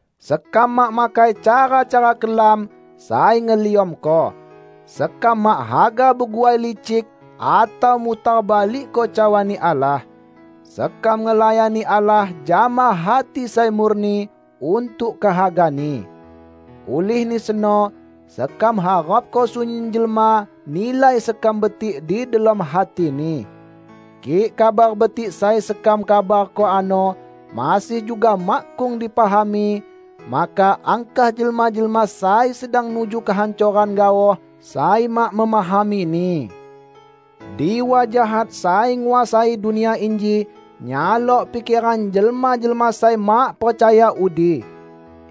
Sekam mak makai cara-cara kelam sai ngeliamko. Sekam mak haga beguai licik atau mutar balikko cawa-Ni Allah. Sekam ngelayani Allah jama hati sai murni untuk kehaga-Ni. Ulihni seno, sekam harapko sunyin jelma nilai sekam betik di delom hatini. Kik Kabar Betik sai sekam kabarko ano masih juga makkung dipahami, maka angkah jelma-jelma sai sedang nuju kehancoran gaoh sai mak memahamini. Diwa jahat sai nguasai dunia inji nyalok pikeran jelma-jelma sai mak percaya udi.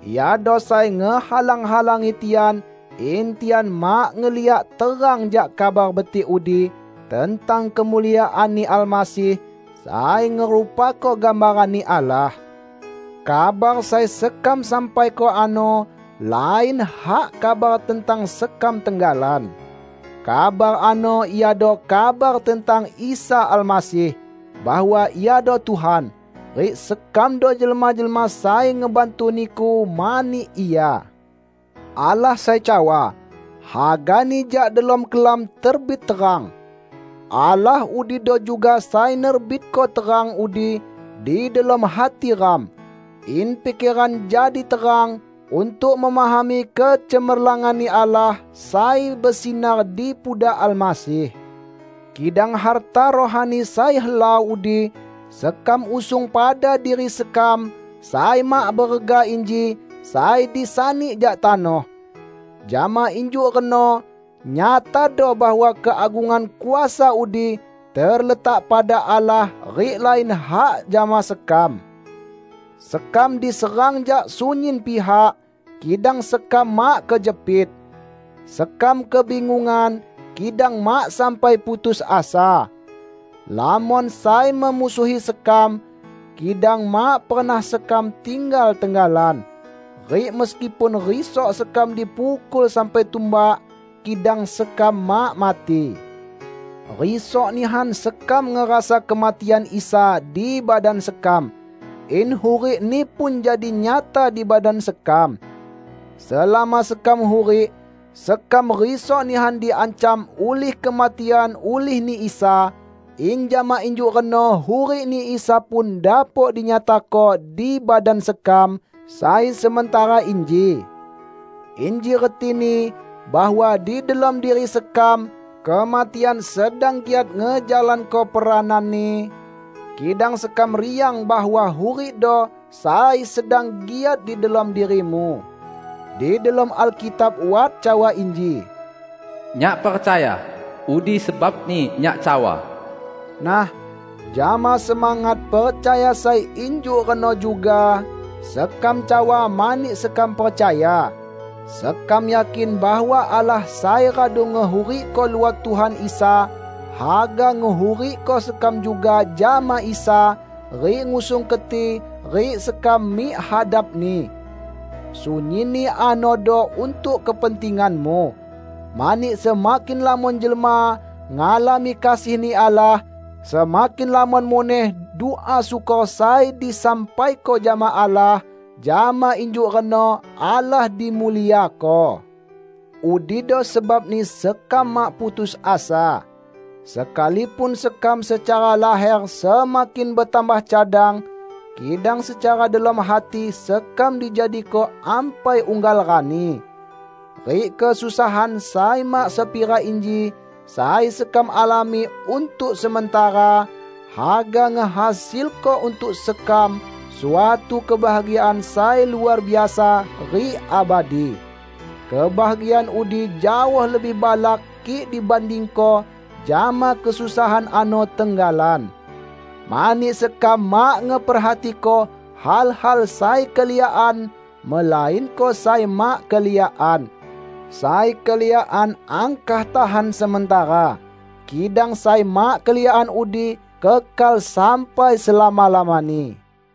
Iado sai ngehalang-halangi tian in tian mak ngeliak terang jak Kabar Betik udi tentang kemuliaan-Ni Almasih, sai ngerupako gambaran-Ni Allah. Kabar sai sekam sampaiko ano lain hak kabar tentang sekam tenggalan. Kabar ano iado kabar tentang Isa Almasih; bahwa Iado Tuhan; rik sekamdo jelma-jelma sai ngebantu niku mani Ia. Allah sai cawa, "Hagani jak delom kelam terbit terang," Allah udido juga sai nerbitko terang udi di delom hati ram, in pikeran jadi terang untuk memahami kecemerlangan-Ni Allah sai besinar di pudak Almasih. Kidang harta rohani sai helau udi sekam usung pada diri sekam sai mak berega inji sai disani jak tanoh. Jama injuk reno nyatado bahwa keagungan kuasa udi terletak pada Allah rik lain hak jama sekam. Sekam diserang jak sunyin pihak, kidang sekam mak kejepit. Sekam kebingungan, kidang mak sampai putus asa. Lamon sai memusuhi sekam, kidang mak pernah sekam tinggal tenggalan. Rik meskipun risok sekam dipukul sampai tumbak, kidang sekam mak mati. Risok nihan sekam ngerasa kematian Isa di badan sekam, in hurik-Ni pun jadi nyata di badan sekam. Selama sekam hurik, sekam risok nihan diancam ulih kematian ulih-Ni Isa, in jama injuk reno hurik-Ni Isa pun dapok dinyatako di badan sekam sai sementara inji. Inji retini bahwa di delom diri sekam kematian sedang giat ngejalanko perananni, kidang sekam riang bahwa hurikdo sai sedang giat di delom dirimu. Di delom Alkitab wat cawa inji, "Nyak percaya, udi sebabni nyak cawa." Nah, jama semangat percaya sai injuk reno juga, sekam cawa mani sekam percaya. Sekam yakin bahwa Allah sai radu ngehurikko luot Tuhan Isa, haga ngehurikko sekam juga jama Isa, rik ngusung keti rik sekam mik hadap-Ni. Sunyinni anodo untuk kepentinganmu. Mani semakin lamon jelma ngalami kasih-Ni Allah, semakin lamon muneh dua syukor sai disampaiko jama Allah; jama injuk reno Allah dimuliako. Udido sebabni sekam mak putus asa. Sekalipun sekam secara laher semakin betambah cadang, kidang secara delom hati sekam dijadiko ampai unggal rani. Rik kesusahan sai mak sepira inji, sai sekam alami untuk sementara, haga ngehasilko untuk sekam suatu kebahagiaan sai luar biasa rik abadi. Kebahagiaan udi jaoh lebih balak kik dibandingko jama kesusahan ano tenggalan. Mani sekam mak ngeperhatiko hal-hal sai keliakan melainko sai mak keliakan. Sai keliakan angkah tahan sementara, kidang sai mak keliakan udi kekal sampai selama-lamani.